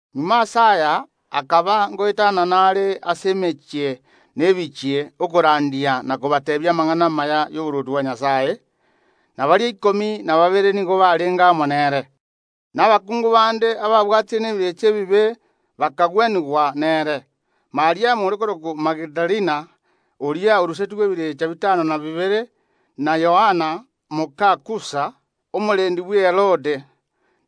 Magega ase aya, akaba ngoetanana are ase emechie na ebichie, okorandia na kobateebia amang’ana amaya ay’oborwoti bwa Nyasae. Na baria ikomi na babere nigo barenge amo nere, na abakungu bande ababwatire n’emeika emebe bakagwenigwa nere: Mariamu ore korokwa Magidalena, oria orusetigwe ebirecha bitano na bibere, na Yoana moka Kusa, omorendi bwe Herode,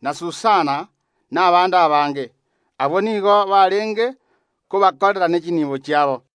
na Susana, na abande abange. Abwo nigo barenge kobakorera ne chinibo chiabo.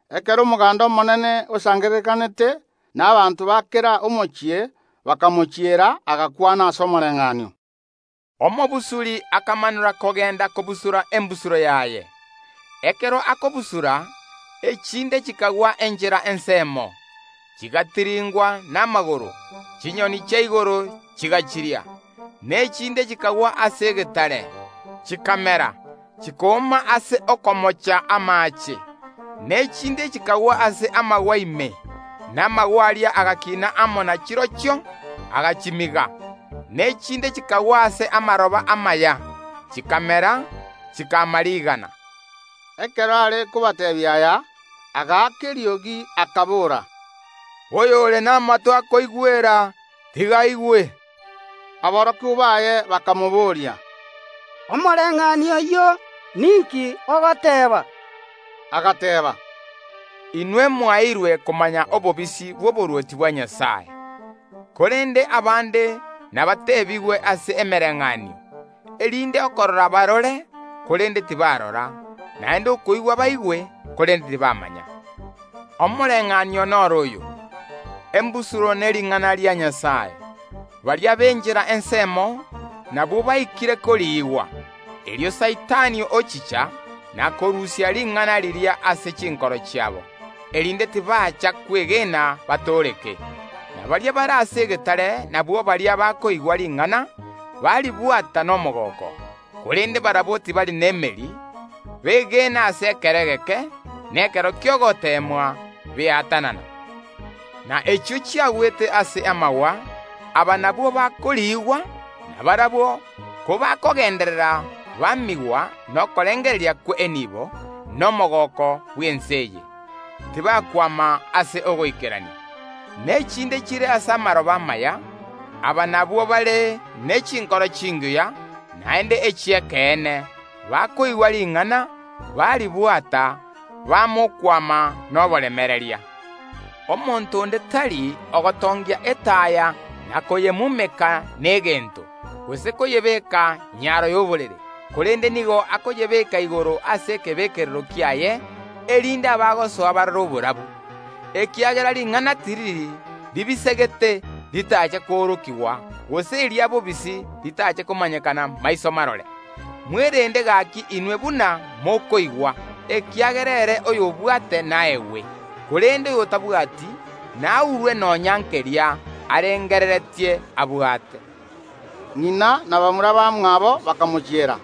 Ekero omoganda omonene osangererekanete, na abanto ba kera omochie bakamochiera, agakwana ase omoreng’anio: “Omobusuri akamanora kogenda kobusura embusuro yaye: Ekero akobusura, echinde chikagwa enchera ensemo, chigatiringwa namagoro, chinyoni chia igoro chigachiria. Na echinde chikagwa ase egetare, chikamera, chikooma ase okomocha amaache. Na echinde chikagwa ase amagwa ime, na amagwa aria agakina amo na chirochio, agachimiga. Na echinde chikagwa ase amaroba amaya, chikamera, chikama rigana.” Ekero are kobateebia aya, agaaka eriogi, akabora, “Oyore namato akoigwera, tiga aigwe.” Aborokigwa baye bakamobooria, “Omoreng’anio oyio ninki ogoteeba?” Agateeba, “Inwe mwaeirwe komanya obobisi bw’oborwoti bwa Nyasae; korende abande nabateebigwe ase emereng’anio, erinde okong’ereria bariingererie, korende tibarora, naende ogotegerera bategerere, korende tibaigwa. Omoreng’anio noro oyo: Embusuro nering’ana ria Nyasae. Baria b’enchera ensemo, nabwo baikire koriigwa; erio Saitani ochicha, na korusia ring’ana riria ase chinkoro chiabo, erinde tibacha kwegena batooreke. Na baria bare ase egetare nabwo baria bakoigwa ring’ana, baribwata nomogooko, korende barabwo tibari nemeri, begena ase ekero egeke, na ekero ki’ogoteemwa beatanana. Na echio chiagwete ase amagwa, aba nabwo bakoriigwa, na barabwo kobakogenderera bamigwa nokorengereria kw’enibo, na omogooko bw’ense eye, tibakwama ase ogoikerania. Na echinde chire ase amaroba amaya; aba nabwo bare ne chinkoro chingiya naende echi’ekeene, bakoigwa ring’ana, baribwata, bama okwama noboremereria. “Omonto onde tari ogotongia etaya na koyemumeka negento, gose koyebeeka nyaro y’oborere; korende nigo akoyebeeka igoro ase ekebekerero kiaye, erinde abagosoa barore oborabu. Ekiagera ring’ana tiriri ribisegete, ritache koorokigwa, gose eria bobisi ritache komanyekana maiso marore. Mwerende gaki inwe buna mokoigwa, ekiagera ere oyobwate naegwe, korende oyotabwati, naurwe nonya nkeria arengereretie abwate.” Ng’ina na bamura bamwabo bakamochiera,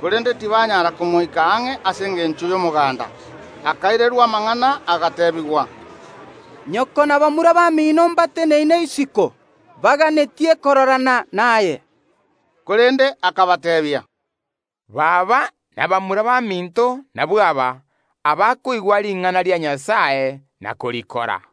korende tibanyara komoika ang’e ase engencho y’omoganda. Akairerwa amang’ana agateebigwa, “Nyoko na bamura bamino mbateneine isiko, baganetie kororana naye.” Korende akabateebia, “Baba na bamura baminto nabwo aba abakoigwa ring’ana ria Nyasae na korikora.”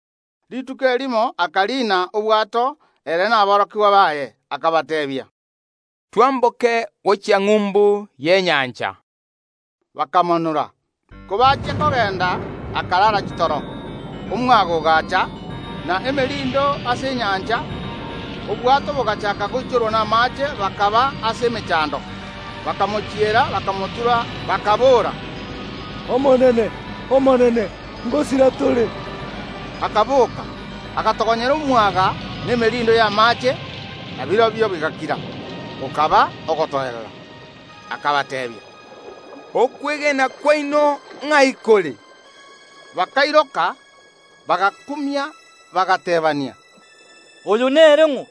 Rituko erimo akariina obwato, ere na aborokigwa baye, akabateebia, “Twamboke gochia ng’umbu y’enyancha.” Bakamanora. Kobachia kogenda, akarara chitoro; omwaga ogaacha, na emerindo ase enyancha, obwato bogaachaka goichorwa namaache, bakaba ase emechando. Bakamochiera, bakamotura, bakaboora, “Omonene Nyasae, ngosira tore!” Erio ere akaboka, agatogonyera omwaga na emerindo y’amaache, na birobio bigakira, gokaba ogotoerera. Akabateebia, “Okwegena kwaino, ng’ai kore?” Bakairoka, bagakumia bagateebania, “Oyo nere ng’o,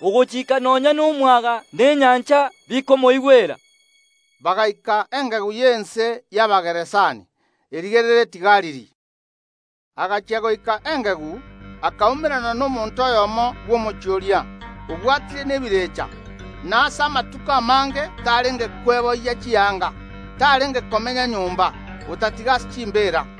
ogochika nonya nomwaga na enyancha, bikomoigwera?” Bagaika engegu y’ense y’Abageraseni, erigereretie Galili. Agachia goika engegu, akaumerana nomonto oyomo bw’omochie oria, obwatire nebirecha; na ase amatuko amange tarenge kweboyia chianga, tarenge komenya nyomba, otatiga ase chimbeera.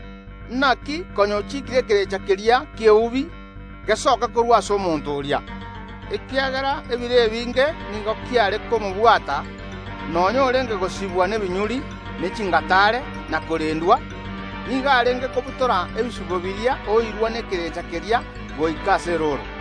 Naki konya ochikiire ekerecha keria ki’eubi gesoke korwa ase omonto oria. (Ekiagera ebiro ebinge nigo kiare komobwata; nonya orenge gosibwa nebinyuri ne chingataare na korendwa, nigo arenge kobutora ebisibo biria oirwa nekerecha keria goika ase erooro.)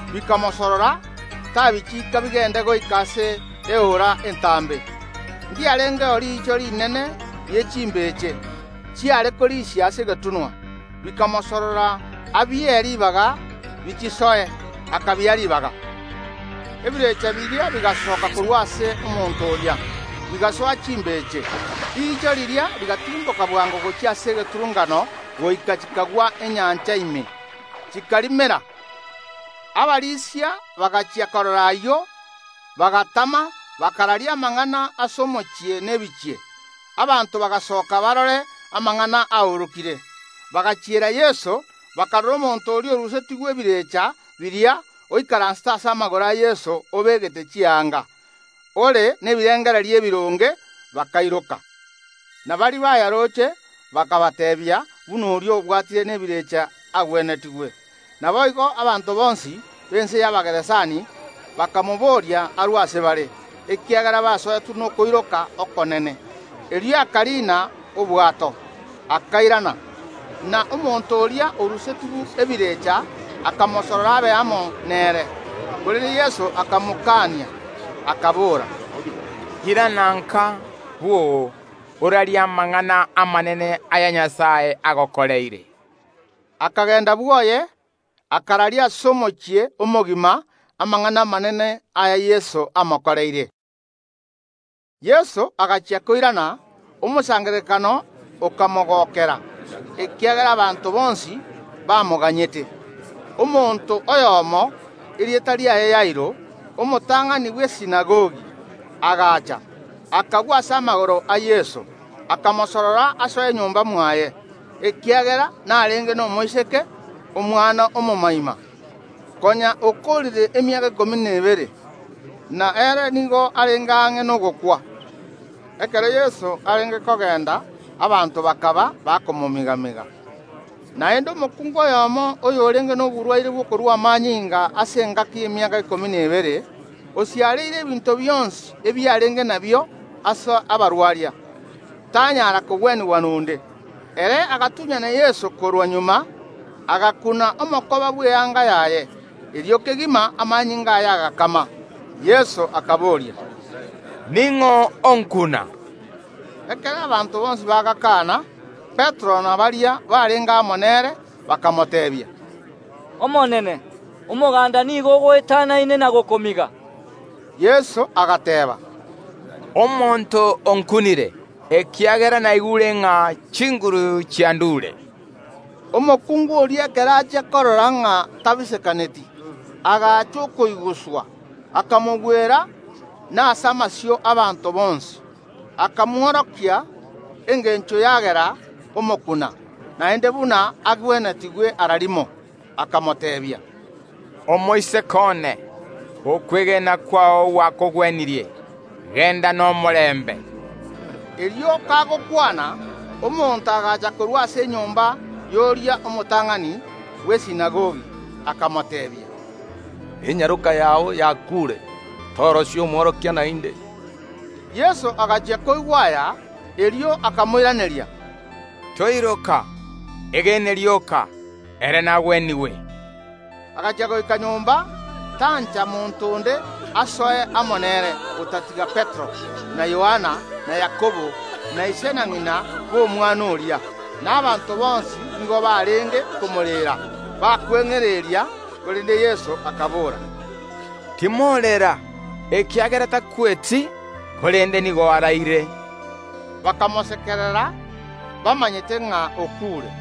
Bikamosorora tabichika bigende goika ase eora entambe. Ndiarengeo riicho rinene rie chimbeche, chiare korisia ase egetunwa, bikamosorora abie ribaga bichisoe. Akabia ribaga. Ebirecha biria bigasoka korwa ase omonto oria, bigasoa chimbeche. Riicho riria rigatirimboka bwango gochia ase egeturunkano goika chikagwa enyancha ime, chikarimera. Abarisia bagachia korora ayio, bagatama, bakararia amang’ana ase omochie na ebichie. Abanto bagasoka barore amang’ana aorokire; bagachiera Yeso, bakarora omonto oria orusetigwe ebirecha biria oikaransete ase amagoro a Yeso obegete chianga, ore nebirengererio ebironge, bakairoka. Na baria bayaroche bakabateebia buna oria obwatire nebirecha agwenetigwe. Naboigo abanto bonsi b’ense y’Abageraseni bakamobooria arue ase bare, ekiagera basoetwe nokoiroka okonene. Erio akariina obwato, akairana. Na omonto oria orusetigwe ebirecha akamosorora abe amo nere, korende Yeso akamokania, akabora, “Irana nka bwoo orarie amang’ana amanene aya Nyasae agokoreire.” Akagenda bwoye, akararia ase omochie omogima amang’ana amanene aya Yeso amokoreire. Yeso agachia koirana, omosangererekano okamogokera, ekiagera abanto bonsi bamoganyete. Omonto oyomo, erieta riaye Yairo, omotang’ani bw’esinagogi, agacha, akagwa ase amagoro a Yeso, akamosorora asoe nyomba mwaye, ekiagera narenge nomoiseke, omwana omomoima, konya okoorire emiaka ikomi na ebere, na ere nigo arenge ang’e ogokwa. Ekero Yeso arenge kogenda abanto bakaba bakomomiga‐miga. Naende omokungu oyomo oyorenge noborwaire bw’okorua amanyinga ase engaki y’emiaka ikomi na ebere, konya oonirie ebinto bionsi ebiarenge nabio ase abarwaria, tanyara kogwenigwa nonde. Ere agatunyana Yeso korwa magega, agakuna omokoba bw’eanga yaye; erio kegima amanyinga aye agakama. Yeso akabooria, “Ning’o onkuna?” Ekero abanto bonsi bagakana, Petero na baria barenge amo nere bakamoteebia, “Omonene, omoganda nigo ogoetanaine na gokomiga.” Yeso agateeba, “Omonto onkunire, ekiagera naigure ng’a chinguru chiandure.” Omokungu oria ekero achia korora ng’a tabisekaneti, agacha okoiguswa, akamogwera, na ase amasio ’abaanto bonsi akamworokia engencho yagera omokuna, naende buna agwenetigwe ara rimo. Akamoteebia, “Omoiseke one, okwegena kwao gwakogwenirie; genda nomorembe.” Erio kagokwana, omonto agacha korwa ase enyomba y’oria omotang’ani bw’esinagogi, akamoteebia, “Enyaroka yao yakuure, torosia omworokia naende.” Yeso agachia koigwa aya, erio akamoiraneria, “Toiroka; egene rioka, ere nagwenigwe.” Agachia goika nyomba, tancha monto onde asoe amo nere otatiga Petero, na Yohana, na Yakobo, na ise na ng’ina b’omwana oria. Na abanto bonsi nigo barenge komoreera, bakweng’ereria, korende Yeso akabora, “Timorera, ekiagera takweti, korende nigo araire.” Bakamosekerera, bamanyete ng’a okuure.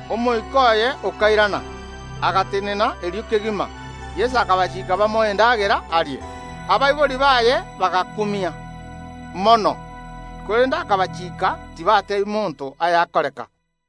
Omoika oye okairana, agatenena erio kegima Yeso akabachiika bamoe endagera arie. Abaibori baye bagakumia, mono, korende akabachiika tibateebia monto ayakoreka.